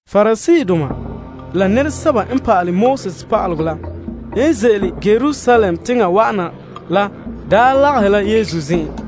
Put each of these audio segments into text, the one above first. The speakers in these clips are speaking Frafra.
Pariseedoma la pa'alegɔ pa'aleba la n ze'ele Yerusalem teŋa wa'ana la daa lagahɛ la Yesu zen'en,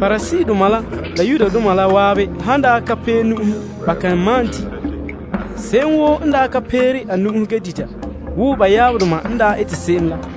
Pariseedoma la Yudoma la zan'an kan malom di', ba han ka pee nu'uhen woo ba yaabdoma n daa ete se'em la.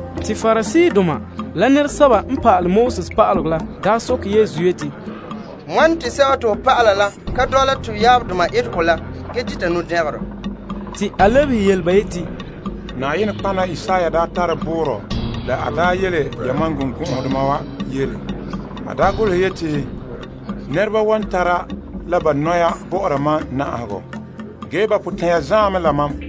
Te Pariseedoma la pa'alegɔ pa'aleba la soke Yesu yeti, Wane te ho dɔlɔba la ka dɔla to yaabdoma etegɔ la ge dita nu'dɛngerɔ? Te a lebehe ba yeti, Nɔtɔgɔha Isaiah daa tare boorɔ la n daa yele yamam birikɔgɔdoma wa yele. A daa golehe yeti, Nɛrebana na'aha mam la ba nɔya ma'an, ge ba suunre zaan mɛ la mam.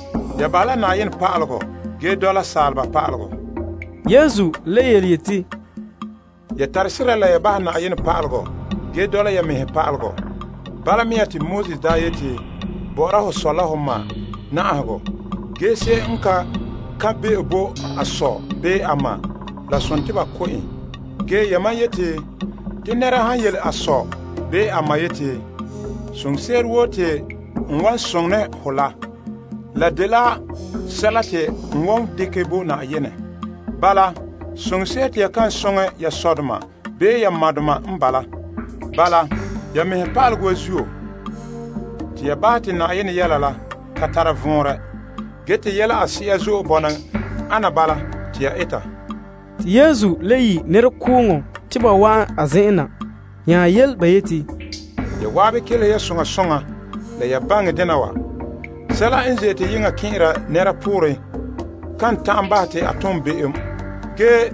Ya bahɛ la Yenɛ pa'alegɔ ge dɔla saaleba pa'alegɔ. A le yeti, Ya mi mɛ ge bahɛ Yenɛ pa'alegɔ ge dɔla ya mɛhe malema. Bala mea te Moses daa yeti, Na'aha ho sɔ, la ho ma, la Se'em n pɔ nɔɔrɛ bahɛ a ma, bii sɔ zuo, ko ya en. Ge yamam yeti, te nɛra han yele a sɔ bii a ma yeti, Soŋse'ere woo te n wan soŋɛ ne ho la, la dela sɛla te n wan dekɛ bo Na'ayenɛ. Bala, soŋse'ere te ya kan soŋɛ ya sɔdoma bii ya madoma n bala. Bala, ya mɛhe malema wa zuo te ya bahɛ te Yenɛ yelehom la ka tara vɔnrɛ, ge te yɛla a se'a zo'e bɔna ana bala te ya eta. Te Yesu le yi' nɛrekooŋɔ te ba wa'an a zen'en na nya yele ba yeti, Ya zan'an kelehe ya soŋa soŋa la ya baŋɛ dena wa. Sɛla n ze'ete yeŋa kɛn'ɛra nɛra pooren kan ta'an bahɛ te a ganlom. Ge,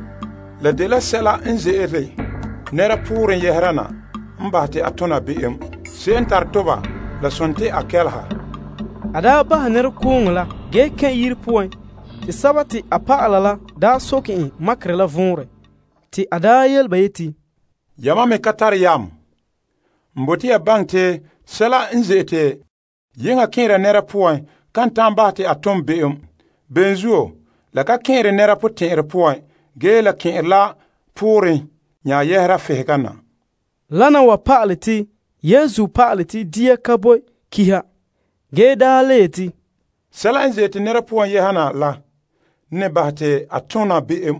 la dela sɛla n ze'ele nɛra pooren yɛhera na n bahɛ te a ganlona. Se'em n tare toba, la sontii a kɛleha. En daa ta bahɛ nɛrekooŋɔ la ge kɛn' yire poan, te a dɔlɔba la soke en makerɛ la vɔnrɛ. A soke ba yeti, Yamam me ya ka tare yam? N bote ya baŋɛ te sɛla n ze'ete yeŋa kɛn'ɛra nɛra poan kan ta'an bahɛ te a ganlona. Ben zuo, la ka kɛn'ɛre nɛra potɛn'ɛrɛ poan ge la kɛn'ɛre la a pooren nya yɛhena. Wana wa pa'ale te Yesu pa'ale te dia ka tare ganleŋɔ. Ge a le yeti, Sɛla n ze'ete nɛra poan yɛha na la ne n bahɛ te a ganlona.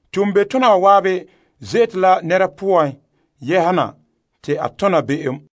Toombe'tona wa zan'an ze'ete la nɛra poan yɛha na te a ganlona.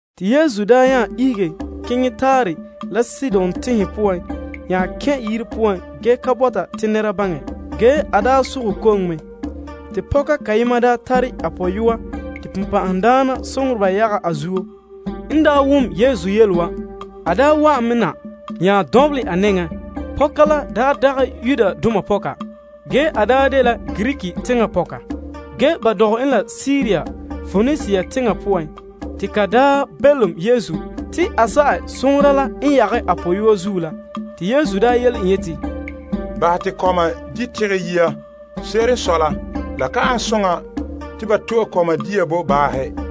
Te Yesu daa nya ihege keŋɛ Tire la Sidon teŋhe poan nya kɛn' yire poan ge ka bɔta te nɛra baŋɛ. Ge a daa sogɛ koŋɛ mɛ. Te pɔka kayema tare a pɔyɔa te bonbe'a yagɛ a zuo. N wom Yesu yele wa, a daa wa'an me na nya dɔnbelɛ a nɛŋan. Pɔka la dagɛ Yudoma pɔka, ge dela Greek teŋa pɔka, ge ba daa dɔgɛ en la Siria Poenisia teŋa poan. Te ka belom Yesu te a sa'ɛ bonbe'a la n yagɛ a pɔyɔa zuo la. Te Yesu yele en yeti, Bahɛ te kɔma di' tegɛ yia. Se'ere n sɔe la la ka an soŋa te ba to'e kɔma dia bo baahe.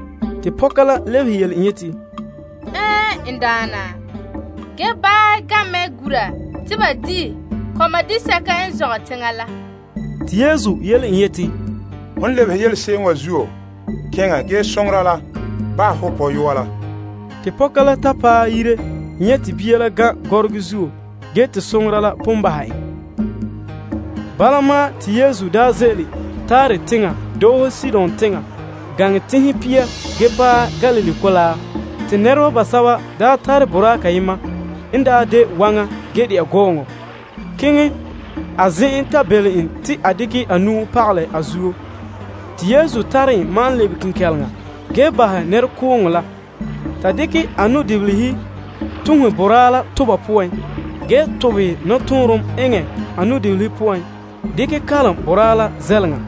Pɔka la lebehe en yeti, Ɛɛn, n Daana, ge baahe gan' mɛ gura te ba di' kɔma disɛka n zɔngɛ teŋa la. Yesu nya yele en yeti, Hon lebehe yele se'em wa zuo, keŋɛ ge bonbe'a la bahɛ ho pɔyɔa la. Te pɔka la ta paɛ yire nyɛ' te bia la gan' gɔrɔgɔ zuo ge te bonbe'a la pon bahɛ en. Bala ma'an, te Yesu daa ze'ele Tire teŋa doohe Sidon teŋa gaŋɛ Galilee Mɔgɔrɛ ge paɛ Teŋhe Pia. Bilam te nɛreba basɛba tare boraa kayema n de waŋa ge dɛna gɔɔŋɔ keŋɛ a zen'en, ta belom en te a dekɛ a nu'o pagalɛ a zuo. Yesu n tare en ma'an lebe kenkɛleŋa ge bahɛ nɛrekooŋɔ la, ta dekɛ a nu'dibilihe tuhe boraa la toba poan ge tobehɛ nɔtɔɔnrom ge kalom boraa la zɛleŋa.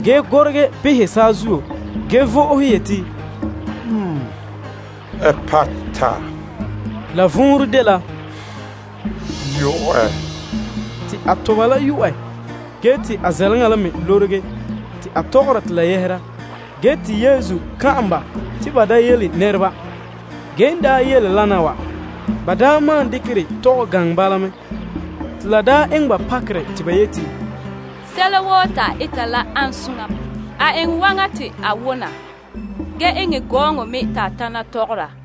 A gorege behɛ saazuo ge vo'ohe yeti, Epata. La vɔnrɛ dela, Yo'ɛ. Te boraa la toba la yo'ɛ ge te a zɛleŋa la me lorege te a tɔgɔra te la yɛhera. Yesu kan'an ba te ba da yele nɛreba. Ge n daa yele wana wa, ba maan dekɛ dɛ tɔgɛ gaŋɛ bala mɛ. Te la eŋɛ ba pakerɛ te ba yeti, Sɛla woo te a eta la, ane soŋa. A eŋɛ waŋa te a wona gee enŋ gɔɔŋɔ me te a tana tɔgɔra.